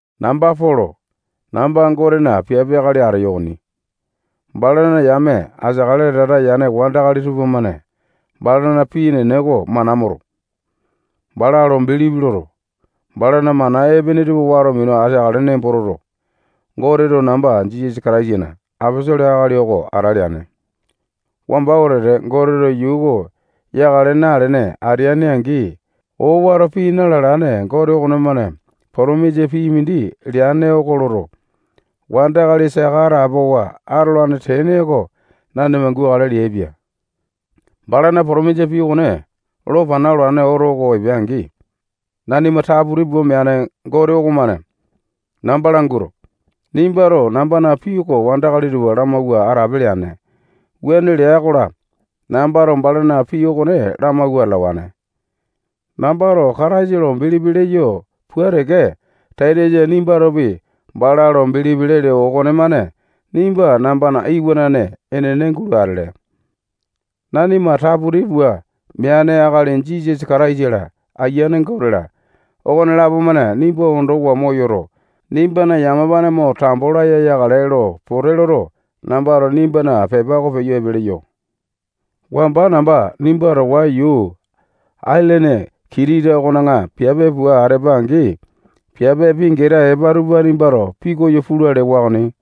Namba Polo. Namba Gotena piape akali ateyo okoni. Balana yame ateakale lata yane wandakali tupamane balana pii enene oko mana moto, bala lo bilipi loto, balana mana epene tupa wato minu ateakale nembo toto, Goteto namba Jisasa Kataisana aposolo akali oko ata leane. Wamba wetete Goteto yuu oko yakale nalene atea-angi, owato pii na-lalane Gote okonemane potomisa pii mindi leane oko loto, wandakali saka atapowa atolane tene oko nanima gukale leaipia. Balana potomisa pii okone lo pana olane oto oko epea-angi, nanima taputi pua meane Gote okomane namba languato, nimbato nambana pii oko wandakali tupa lamawua atape leane. Wuane lea-kola, nambato balana pii okone lamawua atalawane. Nambato Kataisa lo bilipi leyo pua teke, Taitasa nimbatopi bala lo bilipi lele okonemane nimba nambana iwanane enene gulo atele. Nanima taputi pua meane akali Jisasa Kataisa-la, Ayiane Gote-la, okonelapo-mane nimba ondowa moyoto, nimbana yamapane mo tambo laya yakale lo pote loto, nambato nimbana pepa oko peyo epe leyo. Wamba namba nimba towa yuu ailene Kitita okona piape pua atepa-angi, piape pingita epa tupa nimbato pikoyo pula lewa okoni.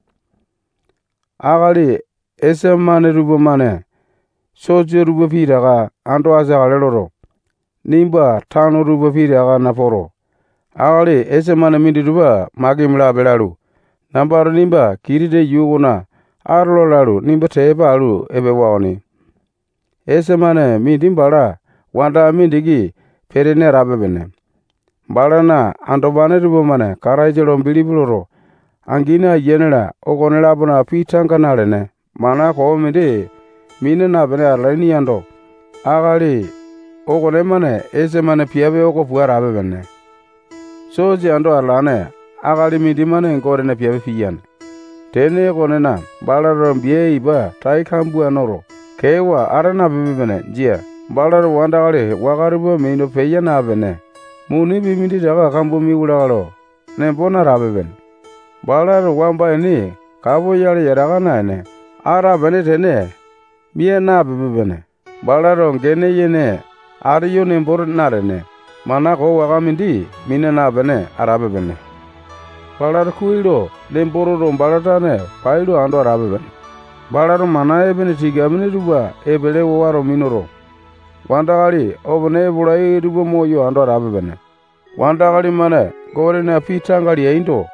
Akali esamane tupamane sosa tupa pitaka ando ateakale loto, nimba tano tupa pitakana poto, akali esamane minditupa makimi lape lalu, nambato nimba Kitita yuu okona atola lalu, nimba tepa alu epewa okoni. Esamane mindi bala wanda mindiki petene atape-pene. Balana andopane tupamane Kataisa lo bilipi loto, angini ayiane-la, okone-lapona pii tanga nalene, mana koo mindi mina napene atalaini yando, akali okonemane esamane piape oko pua atape-pene. Sosa ando atalane akali mindimane Gotena piape piyane. Tene okonena, balato bia ipa tai kambua noto, keewa ata napipe-pene. Jia. Balato wandakali waka tupa minu peya napene, munipi minditaka kambua miauwa lakae lo nembo natape-pene. Balato wamba ini kapoyale yataka naene, atape-pene tene mia napipe-pene. Balato gene yene ateyo nembo natene, mana koo waka mindi mina napene atape-pene. Balato kuai lo nembo toto, bala tane pailo ando atape-pene. Balato mana epene tika-pene tupa epelewa wato minuto, wandakali opene epolai tupa moyo ando atape-pene. Wandakali-mane Gotena pii tanga leaindo,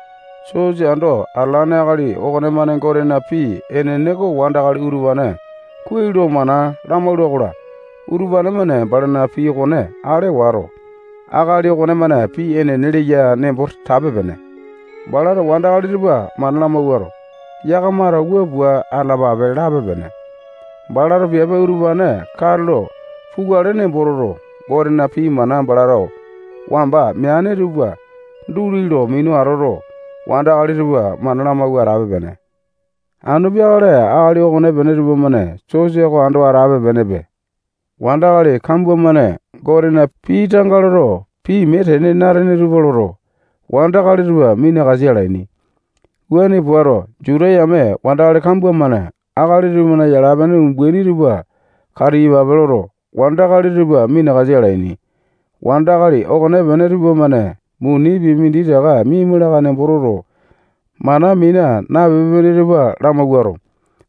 sosa ando atalane akali okonemane Gotena pii enene oko wandakali utupane kuai lo mana lamaula-kola, utupane-mane balana pii okone ale wato, akali okonemane pii enene leya nembo tape-pene. Balato wandakali tupa mana lamawuato, yakamato wua pua atalapape lape-pene. Balato piape utupane katulo pukale nembo toto, Gotena pii mana balato wamba meane tupa duli lo minu atoto, wandakali tupa mana lamawua atape-pene. Anu peakale akali okonepene tupamane sosa oko ando atape-penepe. Wandakali kambua-mane Gotena pii tanga loto, pii mee tene na-atene tupa loto, wandakali tupa minakasa alaini. Wuane puato, Juta yame wandakali kambua-mane akali tupana yala-pene umbaini tupa katiyapale loto, wandakali tupa minakasa alaini. Wandakali okonepene tupamane munipi minditaka mia-makale nembo toto, mana mina napipe-pene tupa lamawuato,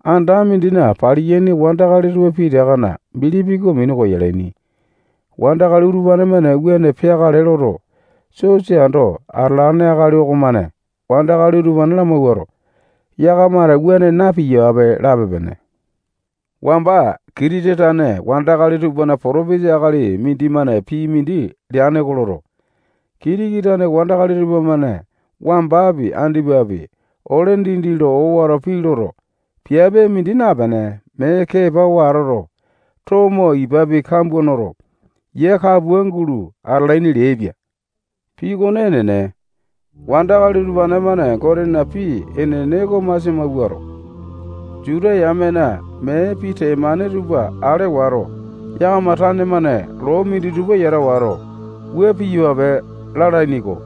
anda mindina paliyaini wandakali tupa pitakana bilipi oko minu koyalaini. Wandakali utupane-mane wuane napeakale loto, sosa ando atalane akali okomane wandakali utupane lamawuato, yakamato wuane na-piyapape lape-pene. Wamba Kitita tane wandakali tupana potopesa akali mindimane pii mindi leane oko loto, Kitita tane wandakali tupamane wambapi, andipapi, ole dindi lo owato pii loto, piape mindi napene, mee kepawa atoto, tomo ipapi kambua noto, yia kapua gulo atalaini leaipia. Pii okone enene. Wandakali utupane-mane Gotena pii enene oko masia mawuato, Juta yamena mee pii temane tupa ale wato, yakama tane-mane loo minditupa yata wato, wua piyapape lalaini-ko.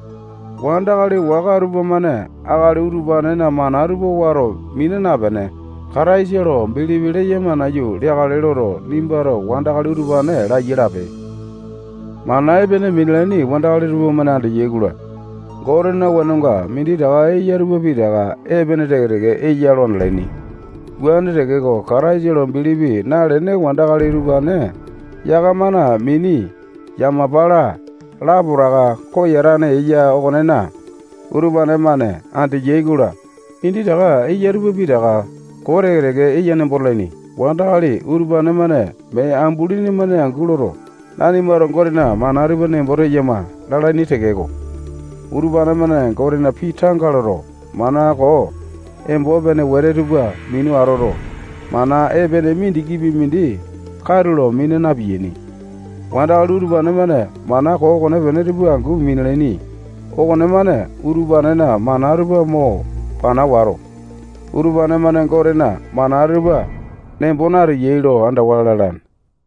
Wandakali waka tupamane akali utupanena mana tupa wato mina napene, Kataisa lo bilipi leyama nayu leakale loto, nimbato wandakali utupane laiya lape. Mana epene minalaini wandakali tupamane andeyai-kola, Gotena wenonga minditaka eya tupa pitaka epene teke-teke eya lo andalaini. Wuane tekeko, Kataisa lo bilipi nalene wandakali utupane yakamana mini yamapa-la, lapotaka koyatane eya okonena, utupane-mane andeyai-kola, minditaka eya tupa pitaka koo teke-teke eya nembo talaini. Wandakali utupane-mane mee ambulini-mane angu loto, nanimato Gotena mana tupa nembo teyama lalaini tekeko, utupane-mane Gotena pii tanga loto, mana koo embo-pene wete tupa minu atoto, mana epene mindikipi mindi katulo mina na-piyaini. Wandakali utupane-mane mana koo okonepene tupa angu minalaini okonemane utupanena mana tupa mo pana wato, utupane-mane Gotena mana tupa nembo nateyai lo andawa lalane.